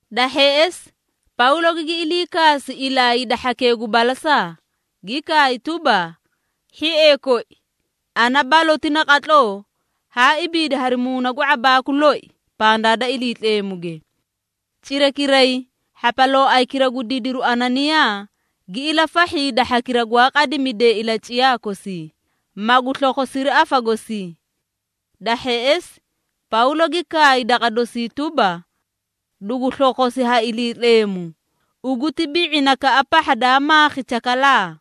Da hheꞌesi, Pawlo gigi ilii kaasi ilaa hida hhakee gu balasaa, gi kaay tuba, “Hhiee koi, ana baloti naqatloo haa ibiidi hari muuna gu ⁄abaaku loi pandaa da Iliitleemuge.” Cirakiray, hhapalooaykira gu didiru Ananiyaa gi ilafahhi hida hhakira gwaa qadimidee ilaciyaa kosii, magu slokhosiri afa gosii. Da hheꞌesi, Pawlo gi kaay daqa dosii tuba, “Dugu slokhosi ha Iliitleemu, ugu ti bi⁄inakaꞌa pahha daa maakhi chakalaa!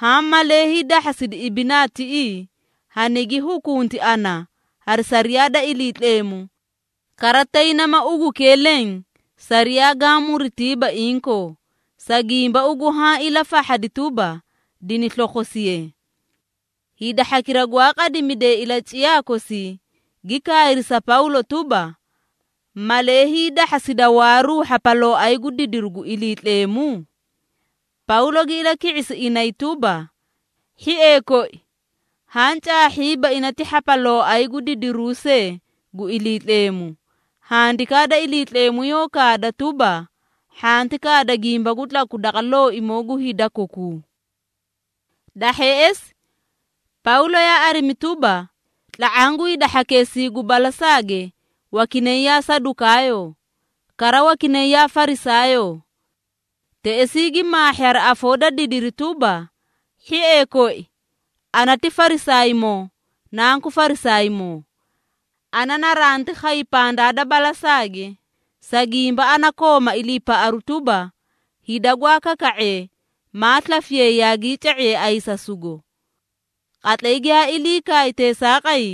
Haã malee hiidahhasidi ibinaa tiꞌii, hanigi hukunti ana hari sariyaa da Iliitleemu, kara tay nama ugukee leẽ sariyaa gaã muritiiba inkoo, sa gimba ugu haã ilafahhadi tuba, dini slokhosiye.” Hida hhakira gwaa qadimidee ilaciyaa kosii, gi kaayri sa Pawlo tuba, “Malee hiidahhasida waaru hhapalooay gu didiru gu Iliitleemu?” Pawlo gi ilaki⁄isi inay tuba, “Hhiee koi, haã caahhiiba ina ti hhapalooay gu didiruu see gu Iliitleemu. Handikaa da Iliitleemu yoó kaada tuba, ‘Hhanti kaada gimba gu tlaku daqa looimoo gu hida kokuu.’” Da hheꞌesi, Pawlo yaa arimi tuba, tla⁄aã gu hida hhakeesii gu balasaage wakinay yaa Sadukaayoo, kara wakinay yaa Farisaayoo. Teꞌesii gi maahhi hari afoo da didiri tuba, “Hhiee koi, ana ti Farisaaymoo, nanku Farisaaymoo. Ana naranti khay pandaa da balasaage, sa gimba ana kooma iliipaꞌaru tuba, hida gwaa kaka⁄ee, maa slafiyay yaagii ca⁄iyay ayisasugo.” Qatlay giyaa ilii kaay teesaaqay,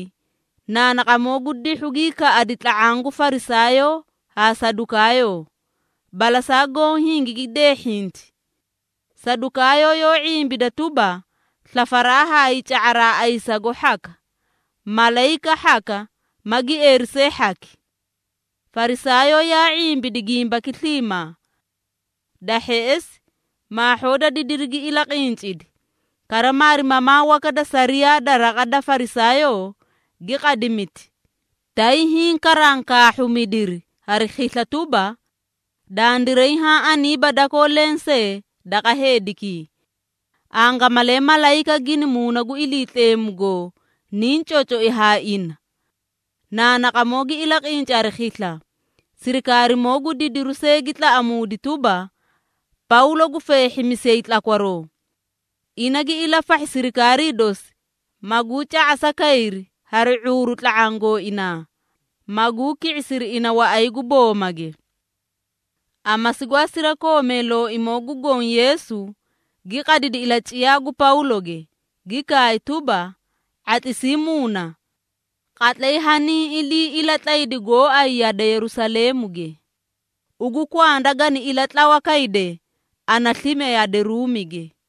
naanaqamoo gu dihhu gii kaꞌadi tla⁄aã gu Farisaayoo haa Sadukaayoo, balasaa goõ hingigi deehhinti. Sadukaayoo yoó ⁄imbida tuba, slafaraa haa hiica⁄a ayisasugo hhaka, malayika hhaka ma gieeri see hhaki. Farisaayoo, yaa ⁄imbidi gimbaki sliimaa. Da hheꞌesi, maahhoo da didiri gi ilaqincidi, kara maarimamaa waka da sariyaa da raqa da Farisaayoo, gi qadimiti, tay hiĩ karankaahhuumidiri hari khisla tuba, “Dandiray haã aniiba dakoo lensee daqa heedikii. Angamalee malayika gina Muuna gu Iliitleemu goo niĩ cocoꞌoi haa ina!” Naanaqamoo gi ilaqinci hari khisla, sirikaarimoo gu didiru see gi tlaꞌamuudi tuba, Pawlo gu feehhimisiyay tlakwaroo. Ina gi ilafahhi sirikaarii dosi, maguu ca⁄asa kayri hari ⁄uuru tla⁄aã gooinaa, maguu ki⁄isiri ina waꞌay gu boomage. Amasi gwaa sirakoomee Looimoo gu Goõ Yeesu gi qadidi ilaciyaa gu Pawloge, gi kaay tuba, “⁄atlisii muuna! Qatlay haniĩ ilii ilatlaydi gooay yade Yerusaleemuge, ugu kwanda gani ilatlawa kayde ana slime yade Ruumige.”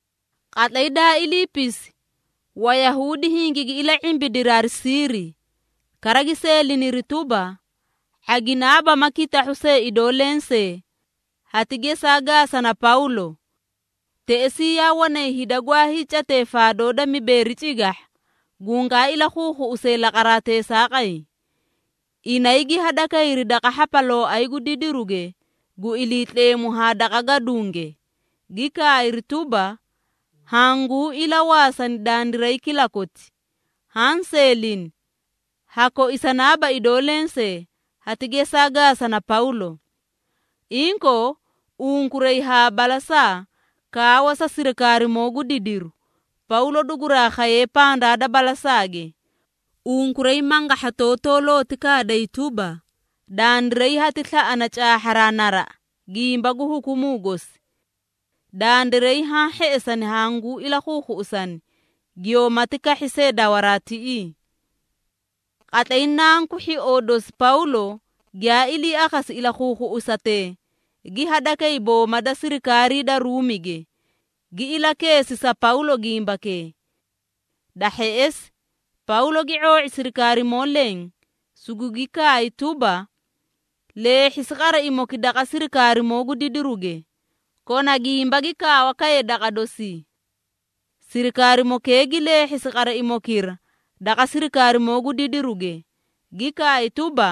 Qatlay daa iliipisi Wayahuudi hingigi ila⁄imbidiri hari siiri, kara gi seeliniri tuba, “⁄aginaaba ma kitahhuu see idoo lensee, hati gesaa gaasana Pawlo.” Teꞌesii yaa wanay hida gwaa hiicatee faadoo da mibeeri cigahha, gungaa ilakhuukhuꞌusee laqaraa teesaaqay. Inay gi hadakayri daqa hhapalooay gu didiruge gu Iliitleemu haa daqa gadunge, gi kaayri tuba, “Hanguu ilawaasani dandiray kilakoti, haã seelini, ha koisanaaba idoo lensee, hati gesaa gaasana Pawlo. Inkoo, unkuray haa balasaa kaawa sa sirikaarimoo gu didiru, Pawlo duguraa khaye pandaa da balasaage, unkuray mangahhatotoo looti kaaday tuba, dandiray hati slaꞌana caahharaa naraꞌa gimba gu hukumuu gosi. Dandiray haã hheꞌesani hanguu ilakhuukhuꞌusani giyoomati kahhi see dawaraa tiꞌii.” Qatlay nanku hhioo dosi Pawlo giyaa ilii akhasi ilakhuukhuꞌusatee, gi hadakay booma da sirikaarii da Ruumige, gi ilakeesi sa Pawlo gimbakee. Da hheꞌesi, Pawlo gi ⁄oo⁄i sirikaarimoo leẽ, sugugi kaay tuba, “Leehhisi qaraimoki daqa sirikaarimoo gu didiruge, kona gimba gi kaawakaye daqa dosii.” Sirikaarimokee gi leehhisi qaraimokira daqa sirikaarimoo gu didiruge, gi kaay tuba,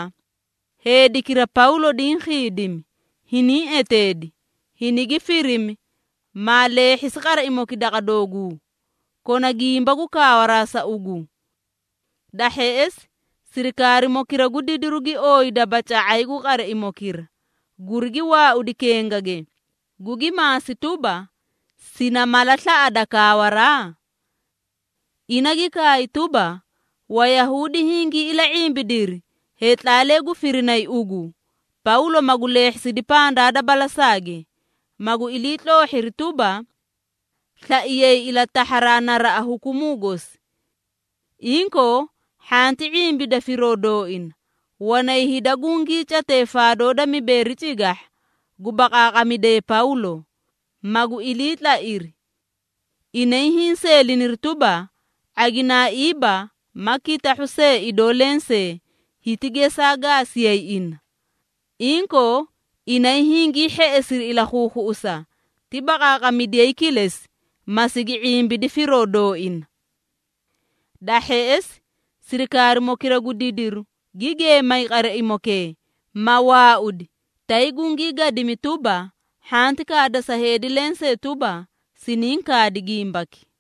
“Heedikira Pawlo diĩ khiidimi, hiniĩ eteedi, hinigi firimi, maa leehhisi qaraimoki daqa dooguu, kona gimba gu kaawaraa sa ugu.” Da hheꞌesi, sirikaarimokira gu didiru gi ooyi dabaca⁄ay gu qaraimokira, gurigi waaudi kengage, gugi maasi tuba, “Sina mala slaꞌada kaawaraa?” Ina gi kaay tuba, “Wayahuudi hingii ila⁄imbidiri heetlaalee gu firinay ugu, Pawlo magu leehhisidi pandaa da balasaage, magu iliitloohhiri tuba, slaiyay ilatahharaa naraꞌa hukumuu gosi. Inkoo, hhanti ⁄imbida firoo dooina, wanay hida gungii catee faadoo da mibeeri cigahha, gu baqaaqamidee Pawlo, magu iliitlairi. Inay hiĩ seeliniri tuba, ⁄aginaaiiba ma kitahhuu see idoo lensee, hiti gesaa gaasiyay ina. Inkoo, inay hingii hheꞌesiri ilakhuukhuꞌusa, ti baqaaqamidiyayi kilesi, ma sigi ⁄imbidi firoo dooina.” Da hheꞌesi, sirikaarimokira gu didiru gi geemay qaraimokee, ma waaudi, tay gugii gadimi tuba, “Hhanti kaada sa heedi lensee tuba, siniĩ kaadi gimbaki.”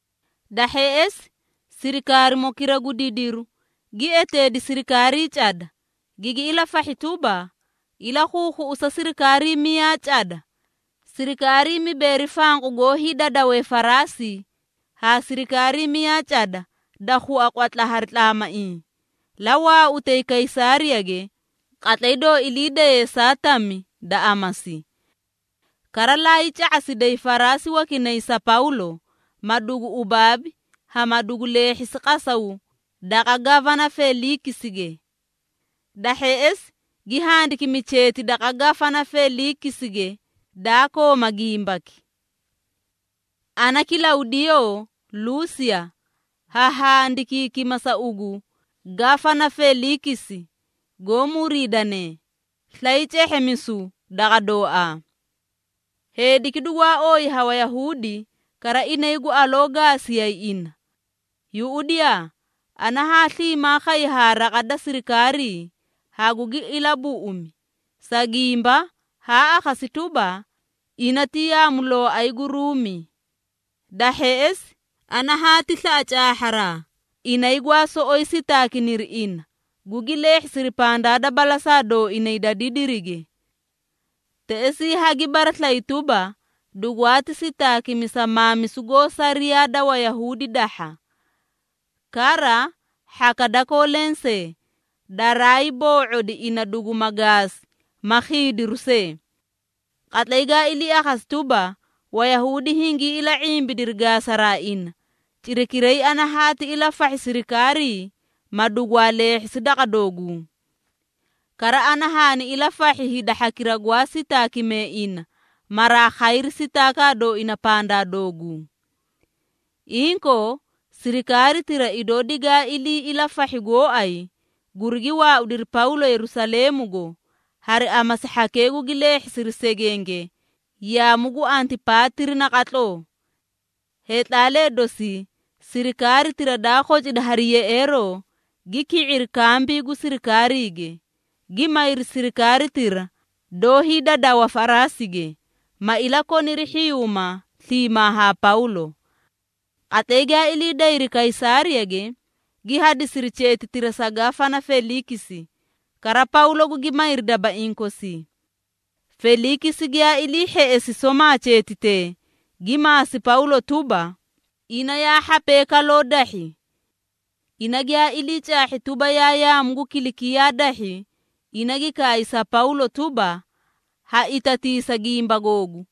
Da hheꞌesi, sirikaarimokira gu didiru gi eteedi sirikaarii cada, gigi ilafahhi tuba, “Ilakhuukhuꞌusa sirikaarii miyaa cada, sirikaarii mibeeri fanqu goó hiidadawee faraasi haa sirikaarii miyaa cada da khua qwatla hari tlaamaiĩ, la waautay Kaysaariyage qatlay doo ilii daye saa tami da amasi. Kara layii ca⁄asiday faraasi wakinay sa Pawlo, ma dugu ubaabi haa ma dugu leehhisi qasaw daqa Gafana Feliikisige.” Da hheꞌesi, gi handikimi cheeti daqa Gafana Feliikisige daa kooma gimbaki. Ana Kilawdiyoo Luusiya, ha handikiikima sa ugu, Gafana Feliikisi, goó muriidane, slay cehheemisu daqa dooaa! Heediki dugwaa ooyi ha Wayahuudi, kara inay gu aloo gaasiyay ina. Yuꞌudiyaa, ana haa sliimaa khay haa raqa da sirikaarii, hagugi ilabuꞌumi, sa gimba haa akhasi tuba, ina ti yaamulooay gu Ruumi. Da hheꞌesi, ana haati slaꞌa caahharaa, inay gwaa soꞌoyi sitaakiniri ina, gugi leehhisi pandaa da balasaa dooinay da didirige. Teꞌesii hagi baraslayi tuba, dugwaati sitaakimi sa maamisu goó sariyaa da Wayahuudi dahha. Kara, hhaka dakoo lensee, daraay boo⁄odi ina duguma gaasi ma khiidiru see. Qatlay gaa ilii akhasi tuba, Wayahuudi hingii ila⁄imbidiri, gaasaraa ina, cirakiray ana hanti ilafahhi siriikaarii, ma dugwaa leehhisi daqa dooguu. Kara ana haani ilafahhi hida hhakira gwaa sitaakimee ina, maraa khayri sitaakaa dooina pandaa dooguu. Inkoo, sirikaaritira idoo digaa ilii ilafahhi gooay, gurigi waaudiri Pawlo Yerusaleemugo, hari amasi hhakee gugi leehhisiri segenge yaamu gu Antipaatiri naqatloo. Heetlaalee dosii sirikaaritira daa khocidi hari yeꞌeeroo, gi ki⁄iri kambii gu sirikaariige, gi mayri sirikaaritira doó hiidadawa faraasige, ma ilakoniri hhiyuuma sliimaa haa Pawlo. Qatlay giyaa ilii dayri Kaysaariyage, gi hadisiri cheetitira sa Gafana Feliikisi, kara Pawlo gugi mayri dabaiĩ kosii. Feliikisi giyaa ilii hheꞌesi somaa cheetitee, gi maasi Pawlo tuba, ina yaa hhapee kaloo dahhi. Ina giyaa ilii caahhi tuba, yaa yaamu gu Kilikiyaa dahhi, ina gi kaay sa Pawlo tuba, “Haitatiisa gimba googu,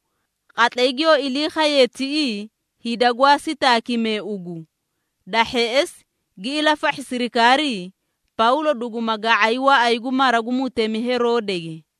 qatlay giyoo ilii khayee tiꞌii hida gwaa sitaakimee ugu.” Da hheꞌesi gi ilafahhi sirikaarii, Pawlo duguma ga⁄ay waꞌay gu mara gu mutemi Heroodege.